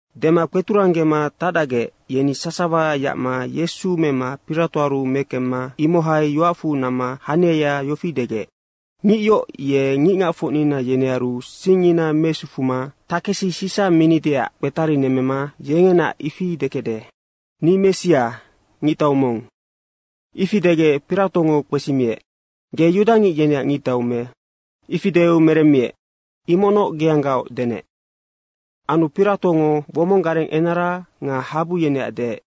Dema kpeturanggema tacdacgec, yeni sasawa yacma Yesu mema Piratoaru mekemma imohai yoacfu namma haniaya yofi degec, “Ngic yoc ye ngicngacfocnina yenearu singngina mesufuma takesi Sisa minideac kpetarinemmema yengenaac ifi dekecde, ‘Ni Messia, ngictau mong.’” Ifi degec Piratongo kpesimiec, “Ge yudangic yeneac ngictau me?” Ifi deu meremmiec, “Imocnoc geanggaoc denec.” Anu Piratongo womong gareng enara nga habu yeneac deec,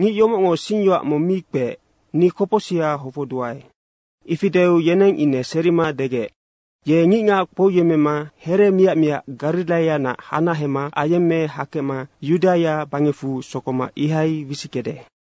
“Ngic yomocngo singyoac mong mi kpeec, ni kopocsiha hofocduae.” Ifi deu yeneng ine serima degec, “Ye ngicngac kpouyemmema here miac miac Gariraianac hanahema ayemme hakecma Yudaia bangecfu sokoma ihai wisickede.”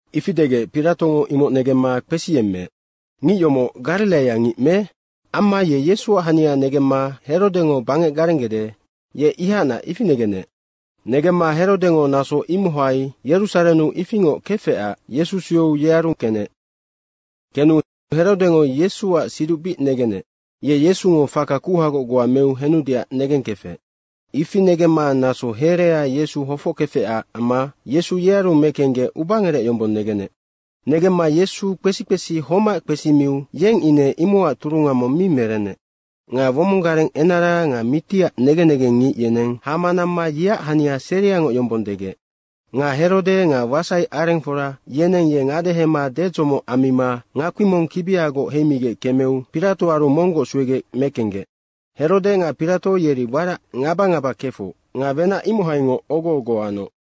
Ifi degec Piratongo imoc negemma kpesiyemmeec, “Ngic yomoc Gariraia ngic me?” Amma ye Yesuac hania negemma Herodengo bangec garenggede, ye ihacnac, ifi negenec. Negemma Herodengo naso imohai Yerusarennu ifingoc kefecac Yesu sueu yearu kenec. Kenu Herodengo Yesuac siduc bic negenec. Ye Yesungo faka kuhagoc goa meu henudeac negengkefec. Ifi negemma naso herea Yesu hofockefecac amma Yesu yearu mekenggec ubangerec yombong negenec. Negemma Yesu kpesi kpesi homac kpesimiu yeng ine imocac turunga mong mi merenec. Nga womong gareng enara nga mitiac negen negengngic yeneng hama namma yeac hania seriangoc yombong degec. Nga Herode nga wasai arengfora yeneng ye ngadehema dedzomoc ammima ngakpi mong kibiagoc heimigec kemeu Piratoaru monggoc suegec mekenggec. Herode nga Pirato yeri warac ngaba ngaba kefoc nga wenac imohaingoc ogo ogo anoc.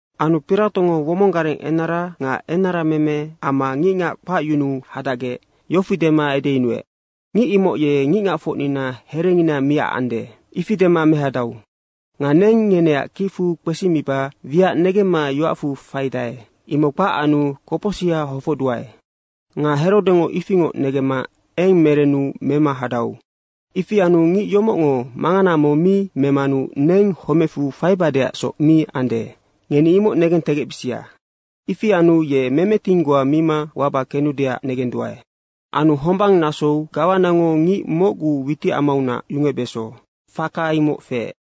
Anu Piratongo womong gareng enara nga enarameme amma ngicngac kpacyunuu hadacgec yofi dema edeyunuec, “Ngic imoc ye ngicngacfocnina herengina miacande, ifi dema mehadau. Nga neng ngeneac kicfu kpesimiba wiac negemma yoacfu faidae, imoc kpac anu kopocsiha hofocduae. Nga Herodengo ifingoc negemma eng merenu mema hadau. Ifi anu ngic yomocngo mangana mong mi memanu neng homecfu faibadeacsoc mi ande, ngeni imoc negentegecbisia. Ifi anu ye memeting goa mima waba kenudeac negenduae.” Anu hombang nasou gawanango ngic mocgu witicamaunac yungecbeso, faka imoc feec.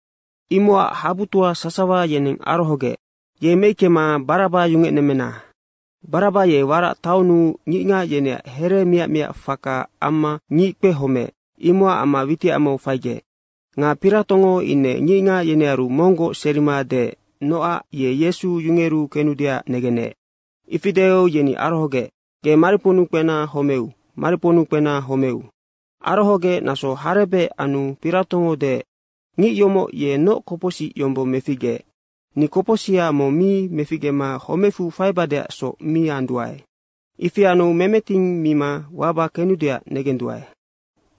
Imocac habutoa sasawa yeneng arohogec, “Ye meickema Baraba yungecnemmena.” Baraba ye warac taonnu ngicngac yeneac here miac miac faka amma ngic kpehomeec, imocac amma witicamau faigec. Nga Piratongo ine ngicngac yenearu monggoc serima deec nocac ye Yesu yungeru kenudeac negenec. Ifi deu yeni arohogec, “Ge mariponnu kpena homeu, mariponnu kpena homeu.” Arohogec naso harebec anu Piratongo deec, “Ngic yomoc ye noc kopocsic yombong meficgeec? Ni kopocsiha mong mi meficgema homecfu faibadeacsoc mi anduae. Ifi anu memeting mima waba kenudeac negenduae.”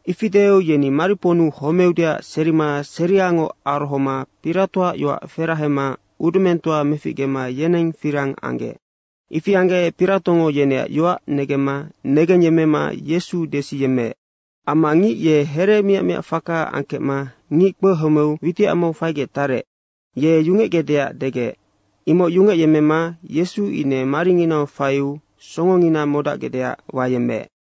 Ifi deu yeni mariponnu homeudeac serima seriangoc arohoma Piratoac yoac ferahema udumengtoa meficgema yeneng firang anggec. Ifi anggec Piratongo yeneac yoac negemma negengyemmema Yesu desiyemmeec. Amma ngic ye here miac miac faka angkecma ngic kpehomeu witicamau faigec tarec, ye yungecgecdeac degec, imoc yungecyemmema Yesu ine maringinau faiu songongina modacgecdeac wayemmeec.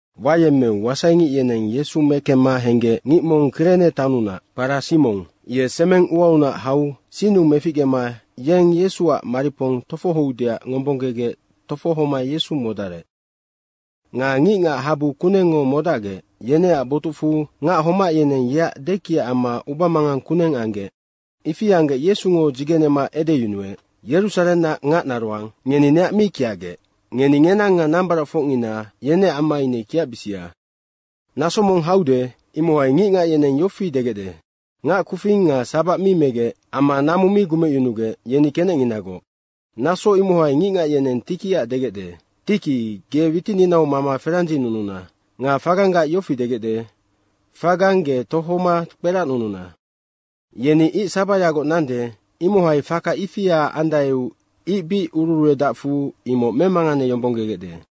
Wayemmeu wasaingic yeneng Yesu mekemma henggec ngic mong Kirene taonnunac, kpara Simong, ye semeng uaunac hau sinnu meficgema yeng Yesuac maripong tofohoudeac ngombonggegec tofohoma Yesu modarec. Nga ngicngac habu kunengngo modacgec, yeneac botucfu ngac homac yeneng yeac dekiac amma ubamangang kuneng anggec. Ifi anggec Yesungo dzigenema edeyunuec, “Yerusarennac ngacnaroang, ngeni neac mi kiacgec. Ngeni ngenang nga nambaracfocngina, yeneac amma ine kiacbisia. Naso mong haude, imohai ngicngac yeneng yofi degecde, ‘Ngac kufing nga sabac mi megec amma namu mi gumecyunugec, yeni kenecnginagoc.’ Naso imohai ngicngac yeneng tikiac degecde, ‘Tiki ge witininau mama ferandzinununa.’ Nga faganggac yofi degecde, ‘Fagang ge tohoma kperacnununa.’ Yeni ic sabayagoc nande, imohai faka ifia andaeu ic bic ururuedacfu, imoc memanganeyombonggegecde.”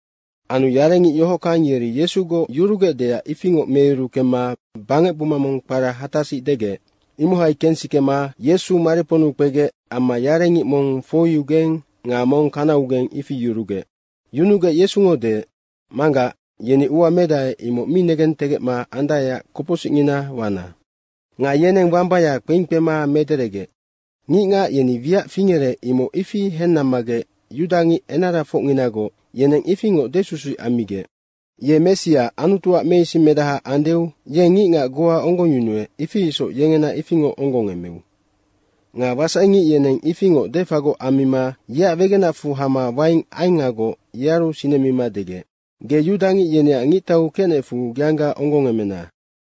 Anu yarengic yohockang yeri Yesugoc yurugecdeac ifingoc meyuru kemma bangec buma mong kpara Hatasic degec, imohai kensikema Yesu mariponnu kpegec amma yarengic mong foiugeng nga mong kanaugeng, ifi yurugec. Yunugec Yesungo deec, “Manggac, yeni ua medae, imoc mi negentegecma andaeac kopocsicngina wana.” Nga yeneng wambaya kpeing kpema mederegec. Ngicngac yeni wiac fingerec, imoc ifi hennammagec yudangic enarafocnginagoc yeneng ifingoc desusuic ammigec, “Ye Messia, Anutuac meisingmedaha andeu yeng ngicngac goa onggongyunuec, ifi isoc yengena ifingoc onggongemeu.” Nga wasaingic yeneng ifingoc defagoc ammima yeac wegenacfu hama waing aengagoc yearu sinemima degec, “Ge yudangic yeneac ngictau kecnecfu geangga onggongemena.”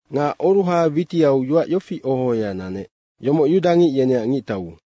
Nga oruha witiau yoac yofi oho ohoya nanec, “Yomoc yudangic yeneac ngictau.”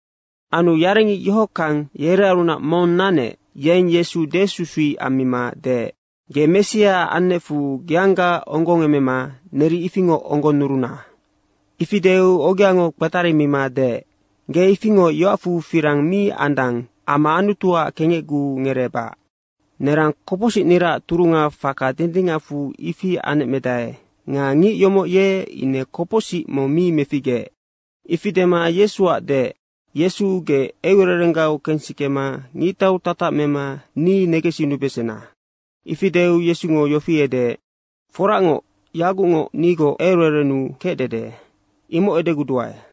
Anu yarengic yohockang yerearunac mong nanec, yeng Yesu desusuic ammima deec, “Ge Messia annecfu geangga onggongemema neri ifingoc onggonnuruna.” Ifi deu ogeango kpetarimima deec, “Ge ifingoc yoacfu firang mi andang amma Anutuac kengecguu ngereebac. Nerang kopocsicniraac turunga faka dindingacfu ifi anecmedae nga ngic yomoc ye ine kopocsic mong mi meficgeec.” Ifi dema Yesuac deec, “Yesu, ge eucererenggau kensikema ngictau tatac mema ni negensinubesena.” Ifi deu Yesungo yofi edeec, “Foracngoc, yagucngoc nigoc eucererennu kecdede, imoc edeguduae.”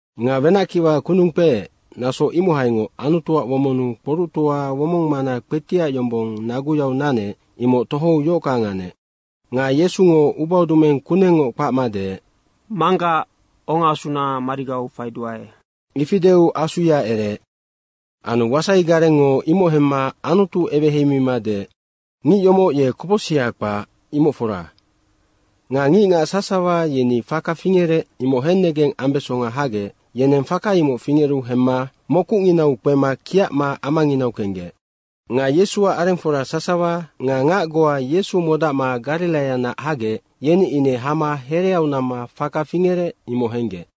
Nga wenackiwa kundung kpeec, naso imohaingoc Anutuac womonnu kpoructoa womongmana kpetiac yombong naguyau nanec, imoc tohou yohockang anec. Nga Yesungo ubaudumeng kunengngoc kpacma deec, “Manggac, ongaasuna marigau faiduae.” Ifi deu asuya ereec. Anu wasai garengngo imoc hemma Anutu eweheimima deec, “Ngic yomoc ye kopocsiha kpac, imoc fora.” Nga ngicngac sasawa yeni faka fingerec, imoc hennegeng ambesonga hagec, yeneng faka imoc fingeru hemma mokucnginau kpema kiacma amanginau kenggec. Nga Yesuac arengfora sasawa nga ngac goa Yesu modacma Gariraianac hagec, yeni ine hama hereau namma faka fingerec, imoc henggec.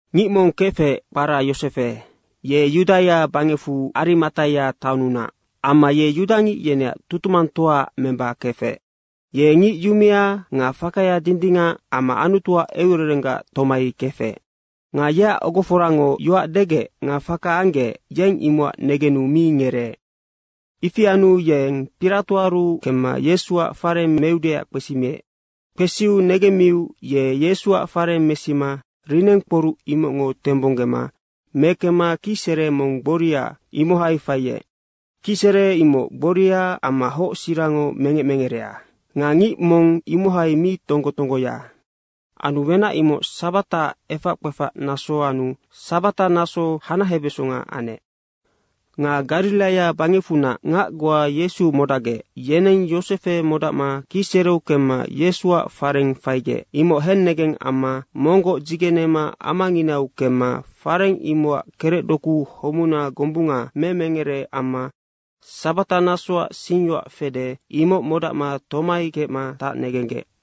Ngic mong kefec kpara Yosefe, ye Yudaia bangecfu Arimataia taonnunac. Amma ye yudangic yeneac tutumangtoaac memba kefec. Ye ngic yumea nga fakaya dindingac amma Anutuac eucererenggac tomai kefec. Nga yeac ogoforango yoac degec nga faka anggec, yeng imocac negenu mi ngereec. Ifi anu yeng Piratoaru kemma Yesuac fareng meudeac kpesimiec. Kpesiu negemmiu ye Yesuac fareng mesima linengkporuc imocngo tembonggema mekemma kicsere mong gboria, imohai faiec. Kicsere imoc gboria amma hoc sirango mengec mengerea nga ngic mong imohai mi tonggo tonggoya. Anu wenac imoc sabataac efac kpefac naso anu sabata naso hanahebeso anec. Nga Gariraia bangecfunac ngac goa Yesu modacgec, yeneng Yosefe modacma kicsereu kemma Yesuac fareng faigec, imoc hennegeng amma monggoc dzigenema amanginau kemma fareng imocac kerecdoku homuna gombunga memengere amma sabatanasoac singyoac fede, imoc modacma tomai kecma tacnegenggec.